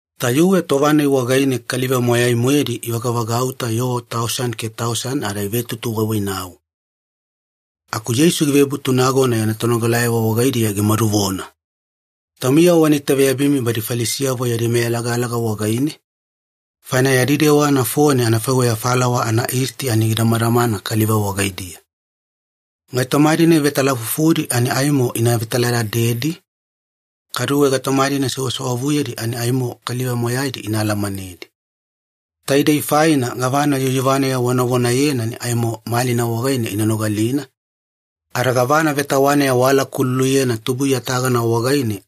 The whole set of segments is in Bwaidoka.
Tayuwe tova-nai wagaine kaliva moyai-moedi ivagavagauta yoo tausani ke tausani ada ivetutuwaiwainau. Aku Yeisu givebutu nagona yana tonogalayavo wagaidiya gimaduvona, “Taumiyavo wana itaveyabimi badi Falisiyavo yadi meyalagalaga wagaine, faina yadi dewa nafone anafaiweya falawa anayisti ani gidamadamana kaliva wagaidiya. Gaitoma-dina ivetalafufudi ani aimo ina vetaladadedi, kaduwe gaitoma-dina sewasewavuyedi ani aimo kaliva moyaidi ina alamanedi. Taidei faina gavana yuyuvaneya wavonayena ani aimo malina wagaine ina nogalina, ada gavana vetawaneya waalakululuyena tubuiya tagana wagaine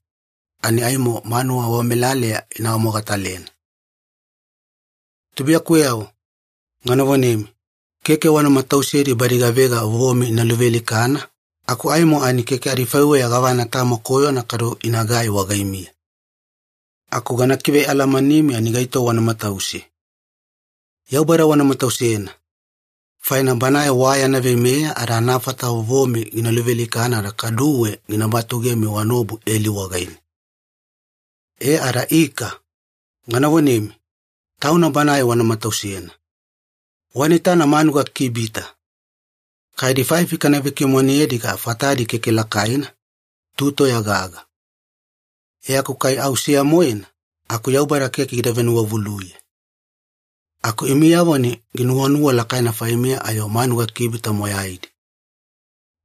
ani aimo manuwa wamelaleya ina awamogatalena. “Tubuiyakuweyavo, gana vonemi, keke wana matausedi badi gavega vovomi ina luvealikana aku aimo ani keke adifaiweya gavana tamo koyona kadu inagai wagaimiya. Aku gana kivealamanimi ani gaito wana matause. Yaubada wana matausena, faina Banae wa yana veimeya ada anafata vovomi gina luvealikana ada kaduwe gina batugemi wanaobu eli wagaine. E ada ika, gana vonemi, Tauna Banae wana matausena. Wana itana manuga kibita. Kai adifaifi kana vekimonedi aga fatadi keke lakaina, tu toya gaga. E aku kai au seya-moena, aku Yaubada keke gida venuwavuluye. Aku imiyavo ani ginuwanuwa lakaina faimiya ayo manuga kibita moyaidi.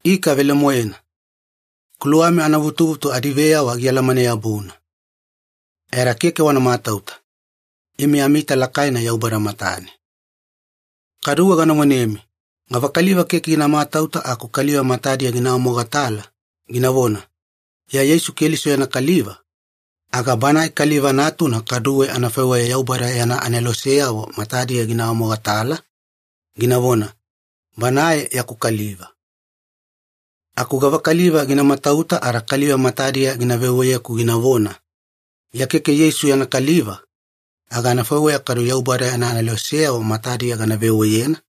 Ika velemoena, kuluwami anavutuvutu adiveyawa gialamane-yabuna. E ada keke wana matauta. Imi amiita lakaina Yaubada matane. “Kaduwe gana vonemi, gavakaliva keke gina matauta aku kaliva matadiya gina awamogatala, ginavona, ‘Iya Yeisu Keliso yana kaliva’, aga Banae Kaliva Natuna kaduwe anafaiweya Yaubada yana aneloseyavo matadiya gina awamogatala, ginavona, ‘Banae yaku kaliva’. Aku gavakaliva gina matauta ada kaliva matadiya gina veweyeku ginavona, ‘Iya keke Yeisu yana kaliva’, aga anafaiweya kaduwe Yaubada yana aneloseyavo matadiya gana veweyena,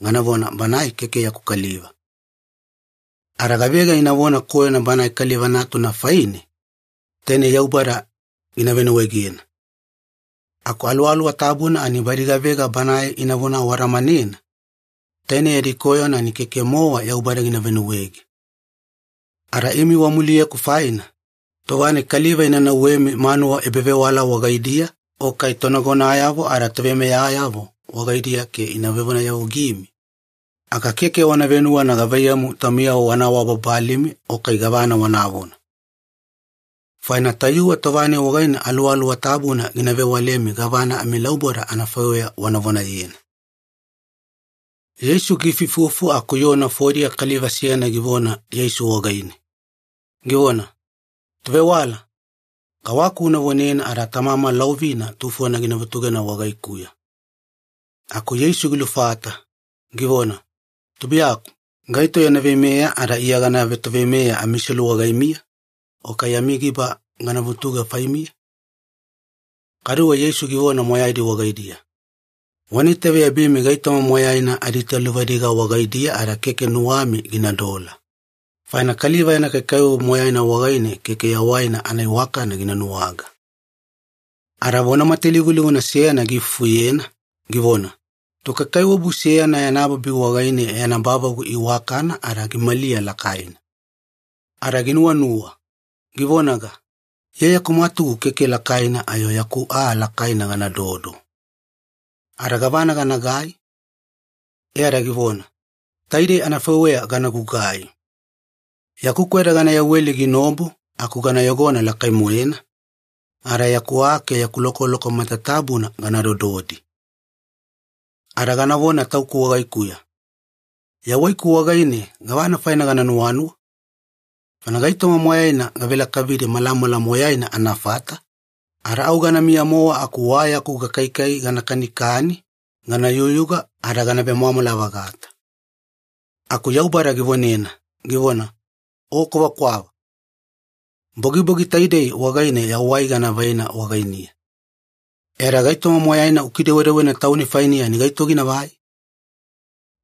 ganavona, ‘Banae keke yaku kaliva’. Ada gavega inavona koyona Banae Kaliva Natuna faine, tainei Yaubada gina venuwaegena. Aku Aluwaluwa Tabuna ani badi gavega Banae inavona awadamanena, tainei yadi koyona ani keke-mowa Yaubada gina venuwaege. “Ada imi wamuliyeku faina, tova-nai kaliva ina nauwemi manuwa ebavewala wagaidiya o kai tonagonayavo ada toveimeyayavo wagaidiya ke ina vevonayavugimi, aga keke wana venuwana gavaiyamu taumiyavo wana awabababalimi o kai gavana wanavona. Faina tayuwe tova-nai wagaine Aluwaluwa Tabuna gina vewalemi gavana amilauboda anafaiweya wana vonayena.” Yeisu giifuifufu aku yoo nafodiya kaliva seyana givona Yeisu wagaine, givona, “Tovewala, kawaku una vonena ada tamama laovina tufona gina vutugena wagaikuya.” Aku Yeisu gilufata, givona, “Tubuiyaku, gaito yana veimeya ada Iya gana vetoveimeya amiselu wagaimiya, o kai yami giba gana vutuge faimiya?” Kaduwe Yeisu givona moyaidi wagaidiya, “Wana itaveyabimi gaitoma moyaina adiitaluvadiga wagaidiya ada keke nuwami ginadola, faina kaliva yana kaikaiwabu moyaina wagaine keke yawaina anaiwakana gina nuwaga.” Ada vona matalivulivuna seyana giifufuyena, givona, “Tokaikaiwabu seyana yana babi wagaine yana bavagu iwakana ada gimaliya lakaina. Ada ginuwanuwa, givonaga, ‘Iya yaku mwatugu keke lakaina ayo yaku aa lakaina ganadodo. Ada gavana ganagai?’ E ada givona, ‘Taidei anafaiweya gana gugai. Yaku kweda gana yaweli ginaobu aku gana yogona lakai-moena, ada yaku aa ke yaku lokoloko matatabuna gana dododi. Ada ganavona tauku wagaikuya, “Yawaiku wagaine gavana faine gana nuwanuwa? Faina gaitoma moyaina gavelakavidi malamala moyaina anafata, ada au ganamiya-mowa aku wa yaku gakaikai gana kanikani gana yugayuga ada gana vemwamwala-vagata.”; “Aku Yaubada givonena, givona, ‘O kwavakwava! Bogibogi taidei wagaine yawai gana vaina wagainiya. E ada gaitoma moyaina ukidewedewena tauni fainiya ani gaito ginavai?’”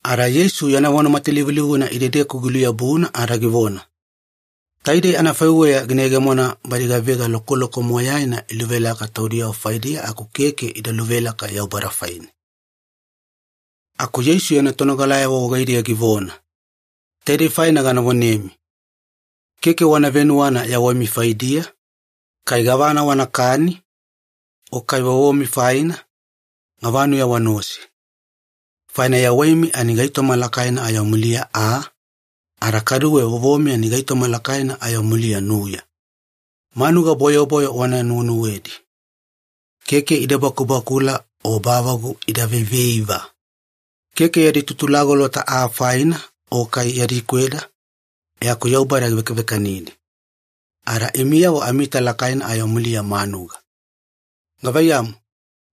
Ada Yeisu yana vona matalivulivuna idedeku giluyabuna ada givona, “Taidei anafaiweya gina yegemona badi gavega lokoloko moyaina iluvelaka taudiyavo faidiya aku keke ida luvelaka Yaubada faine.” Aku Yeisu yana tonogalayavo wagaidiya givona, “Taidei faina gana vonemi, keke wana venuwana yawaimi faidiya, kai gavana wanakani, o kai vovomi faina, gavanuya wanaose. Faina yawaimi ani gaitoma lakaina ayo muliya aa, ada kaduwe vovomi ani gaitoma lakaina ayo muliya nuya. Manuga bwayobwayo wana nuwenuwedi. Keke ida bakubakula o bavagu ida veiveiva. Keke yadi tutulagolota aa faina o kai yadi kweda, e aku Yaubada givekavekanidi. Ada imiyavo amiita lakaina ayo muliya manuga. Gavaiyamu,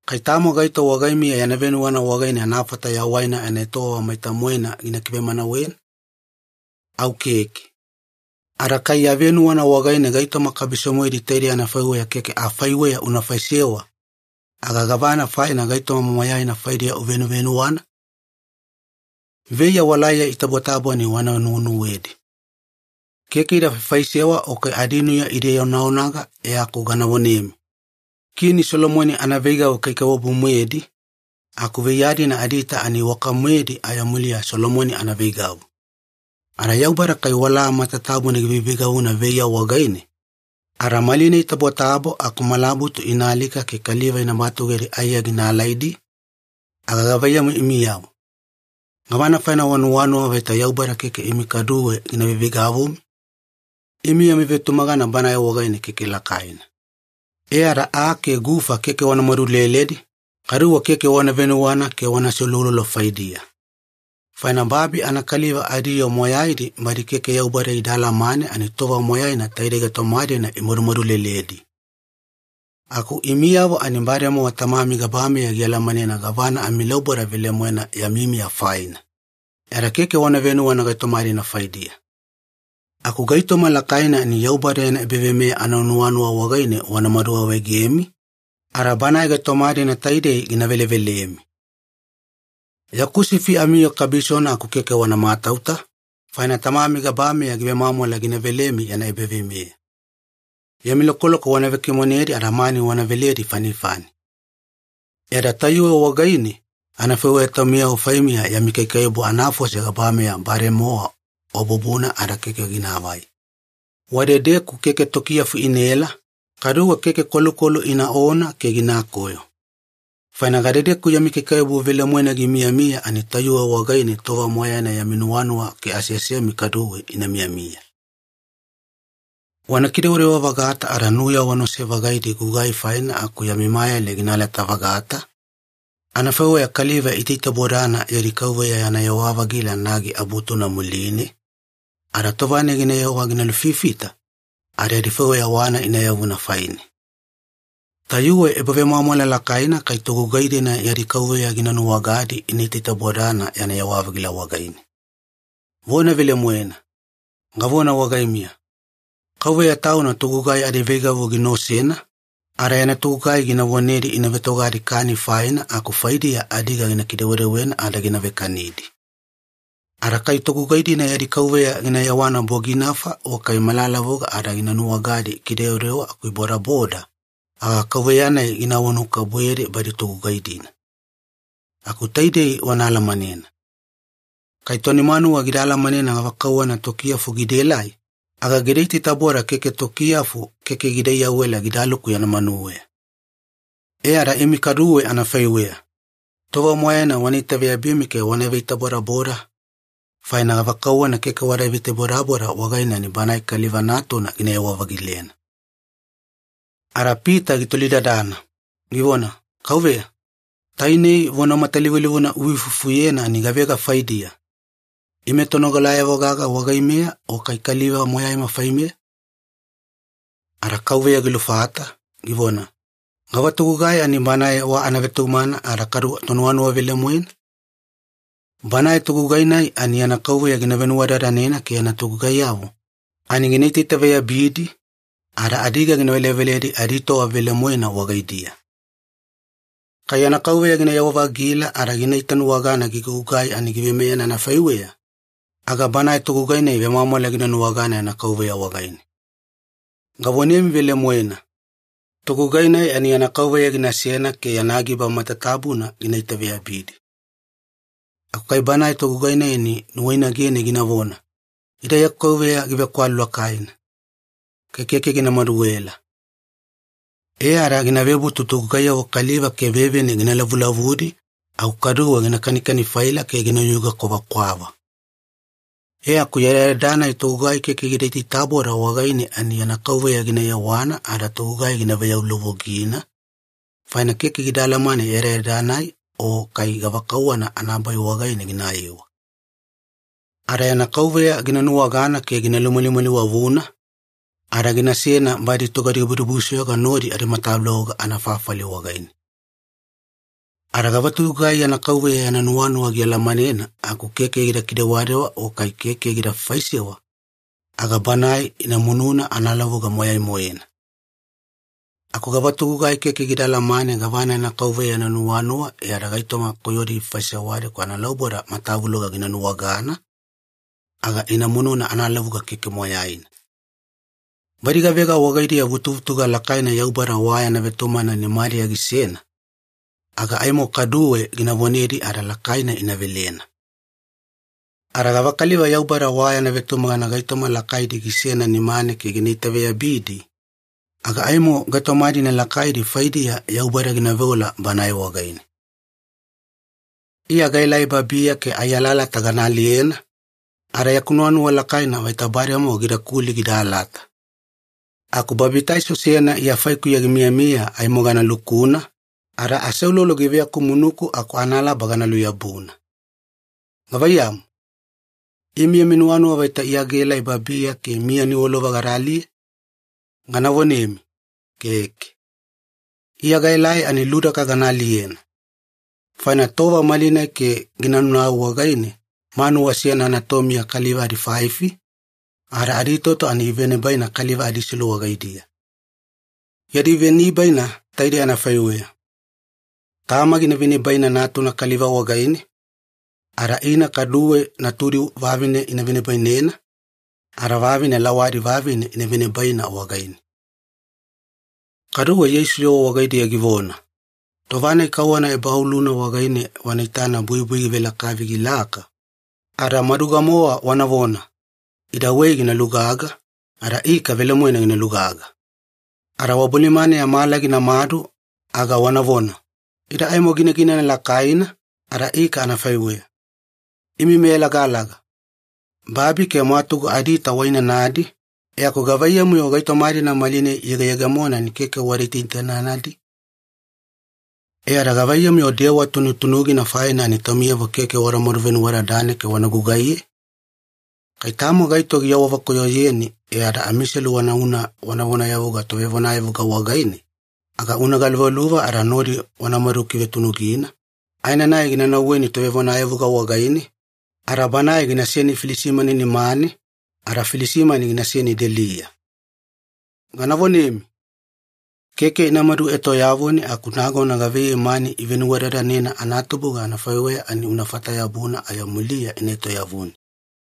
kai tamo gaito wagaimiya yana venuwana wagaine anafata yawaina anaetowava maita-moena gina kivemanawena? Au keke. Ada kai ya venuwana wagaine gaitoma kabiso-moedi taidei anafaiweya keke afaiweya una faisewa, aga gavana faina gaitoma moyaina faidiya uvenuvenuwana? “Veiya walaiya itabotabo ani wana nuwenuwedi. Keke ida faifaisewa o kai adinuya ida ionaonaga e aku gana vonemi, Kini Solomoni anaveigavu kaikaiwabu-moedi, aku veiya-dina adiita ani iwaka-moedi ayo muliya Solomoni anaveigavu. Ada Yaubada kai wala matatabuna giveiveigavuna veiya wagaine, ada malinai itabotabo aku malabutu ina alika ke kaliva ina batugedi aiya gina alaidi, aga gavaiyamu imiyavo? Gavana faina wanuwanuwa vaita Yaubada keke imi kaduwe gina veiveigavumi? Imi yami vetumagana Banae wagaine keke lakaina. E ada aa ke gufa keke wana maduleledi, kaduwe keke wana venuwana ke wana aseuloulolo faidiya. Faina babi anakaliva adiyoo moyaidi badi keke Yaubada ida alamane ani tova moyaina taidei gaitoma-dina imadumadu leledi. Aku imiyavo ani bademowa Tamami gabameya gialamanena gavana amilauboda velemoena yami miya faina, e ada keke wana venuwana gaitoma-dina faidiya. Aku gaitoma lakaina ani Yaubada yana ebaveimeya ananuwanuwa wagaine wanamadu awaegemi, ada Banae gaitoma-dina taidei gina velevelemi. “Yaku sifi amiyoo kabisona aku keke wana matauta, faina Tamami gabameya givemwamwala gina velemi yana ebaveimeya. Yami lokoloko wana vekimonedi ada mani wana veledi fanifani. E ada tayuwe wagaine anafaiweya taumiyavo faimiya yami kaikaiwabu anafose gabameya bademowa wabubuna ada keke ginaavai. Wadedeku keke tokiyafu inaela, kaduwe keke kwalukwalu inaona ke ginakoyo. Faina gadedeku yami kaikaiwabu velemoena gimiyamiya ani tayuwe wagaine tova moyaina yami nuwanuwa ke aseasemi kaduwe ina miyamiya. “Wana kidewadewa-vagata ada nuya wanaose-vagaidi gugai faina aku yami mayale gina alata-vagata, anafaiweya kaliva iitaitabodana yadi kauveya yana yewa-vagila nagi abutuna muline, ada tova-nai ginayewa gina lufifita, ada adifaiweya wana ina yavuna faine. Tayuwe ebavemwamwala lakaina kai togugai-dina yadi kauveya gina nuwagadi ina itaitabodana yana yewa-vagila wagaine. Vona velemoena, gavona wagaimiya, kauveya tauna togugai adiveigavu gina osena, ada yana togugai gina vonedi ina vetogadi kani faina aku faidiya adiga gina kidewedewena ada gina vekanidi. Ada kai togugai-dina yadi kauveya gina yewana boginafa o kai malalavuga ada gina nuwagadi ikidewadewa aku ibodaboda, aga kauveya-nai gina awanuwakabubuyedi badi togugai-dina. Aku taidei wana alamanena. Kai toni manuwa gida alamanena gavakauwana tokiyafu gidaelai, aga gida itaitaboda ke tokiyafu keke gida iyawela gidaluku yana manuweya. E ada imi kaduwe anafaiweya, tova moyaina wana itaveyabimi ke wana veitabodaboda, faina gavakauwana keke wada veitabodaboda wagaine ani Banae Kaliva Natuna ginayewa-vagilena.” Ada Pita gitolidadana, givona, “Kauveya, tainei vona matalivulivuna uifufuyena ani gavega faidiya, ime tonogalayavo gaga wagaimeya o kai kaliva moyaima faimeya?” Ada Kauveya gilufata, givona, “Gava togugai ani banae wa anavetumagana ada kadu tonuwanuwa velemoena? Banae togugai-nai ani yana kauveya gina venuwadadanena ke yana togugaiyavo ani gina itaitaveyabidi, ada adiga gina veleveledi aditova velemoena wagaidiya. Kai yana kauveya ginayewa-vagila ada gina itanuwagana gigugugai ani giveimeyena anafaiweya, aga banae togugai-nai vemwamwala gina nuwagana yana kauveya wagaine. Gavonemi velemoena, togugai-nai ani yana kauveya ginasena ke yana giba matatabuna gina itaveyabidi. Aku kai banae togugai ani nuwainagene ginavona, ‘Ida yaku kauveya givekwalu lakaina. Kai keke gina maduela.’ E ada gina vebutu togugaiyavo kaliva ke vevine gina lavulavudi aku kaduwe gina kanikani-faila ke ginayuga kwavakwava. E aku yadayada-nai togugai keke gida itaitaboda wagaine ani yana kauveya gina yewana ada togugai gina veyaulovogina, faina keke gida alamane yadayada-nai o kai gavakauwana anabai wagaine ginayewa. Ada yana kauveya gina nuwagana ke gina lumalimaliwavuna, ada ginasena badi togadibudibusoyoga nodi adimatavuloga anafafali wagaine. “Ada gavatogugai yana kauveya yana nuwanuwa gialamanena aku keke gida kidewadewa o kai keke gida faisewa, aga banae ina mununa analavuga moyai-moena. Aku gavatogugai keke gida alamane gavana yana kauveya yana nuwanuwa e ada gaitoma koyodi gifaisewadi aku analauboda matavuloga gina nuwagana, aga ina mununa analavuga keke moyaina. Badi gavega wagaidiya vutuvutuga lakaina Yaubada wa yana vetumagana nimadiya gisena, aga aimo kaduwe gina vonedi ada lakaina ina velena. Ada gavakaliva Yaubada wa yana vetumagana gaitoma lakaidi gisena nimane ke gina itaveyabidi, aga aimo gaitoma-dina lakaidi faidiya Yaubada gina veola banae wagaine. “Iya gaelai babiya ke ai alalata gana aliyena, ada yaku nuwanuwa lakaina vaita bademowa gidakuli gida alata. Aku babitaiso seyana Iya faikuya gimiyamiya aimo gana lukuna, ada aseulolo giveakumunuku aku analaba gana luyabuna. Gavaiyamu, imi yami nuwanuwa vaita Iya gaelai babiya ke miya niwalova gada aliye? Gana vonemi, Keke. Iya gaelai ani ludaka gana aliyena. Faina tova malinai ke gina naunau wagaine manuwa seyana anatomiya kaliva adifaifi, ada adiitoto ani ivenibaina kaliva adiselu wagaidiya. Yadi venibaina taidei anafaiweya. Tama gina venibaina natuna kaliva wagaine, ada ina kaduwe natudi vavine ina venibainena, ada vavine lawadi vavine ina venibaina wagaine.” Kaduwe Yeisu yoo wagaidiya givona, “Tova-nai kauwana ebaoluna wagaine wana itana buibui givelakavi gilaka, ada maduga-mowa wanavona, ‘Ida wei gina lugaga,’ ada ika velemoena gina lugaga. Ada wabolimaneya mala ginamadu aga wanavona, ‘Ida aimo ginaginana lakaina,’ ada ika anafaiweya. Imi meyalagalaga! Babi ke mwatugu adiita wainanadi, e aku gavaiyamu-yo gaitoma-dina malinai iyegeyegemona ani keke wada itaitainanadi? “E ada gavaiyamu-yo dewa tunutunugina faina ani taumiyavo keke wanamadu venuwadadane ke wana gugaiye? Kai tamo gaito giawavekoyoyeni e ada amiselu wanauna wana vonayavuga tovevonayavuga wagaine, aga una galuvaluva ada nodi wanamadu kivetunugina aenanai gina nauweni tovevonayavuga wagaine, ada banae ginaseni filisimani nimane, ada filisimani ginaseni deliya. Gana vonemi, keke inamadu etoyavuni aku nagona gavaiyei mani ivenuwadadanena anatubuga anafaiweya ani unafata-yabuna ayo muliya ina etoyavuni.”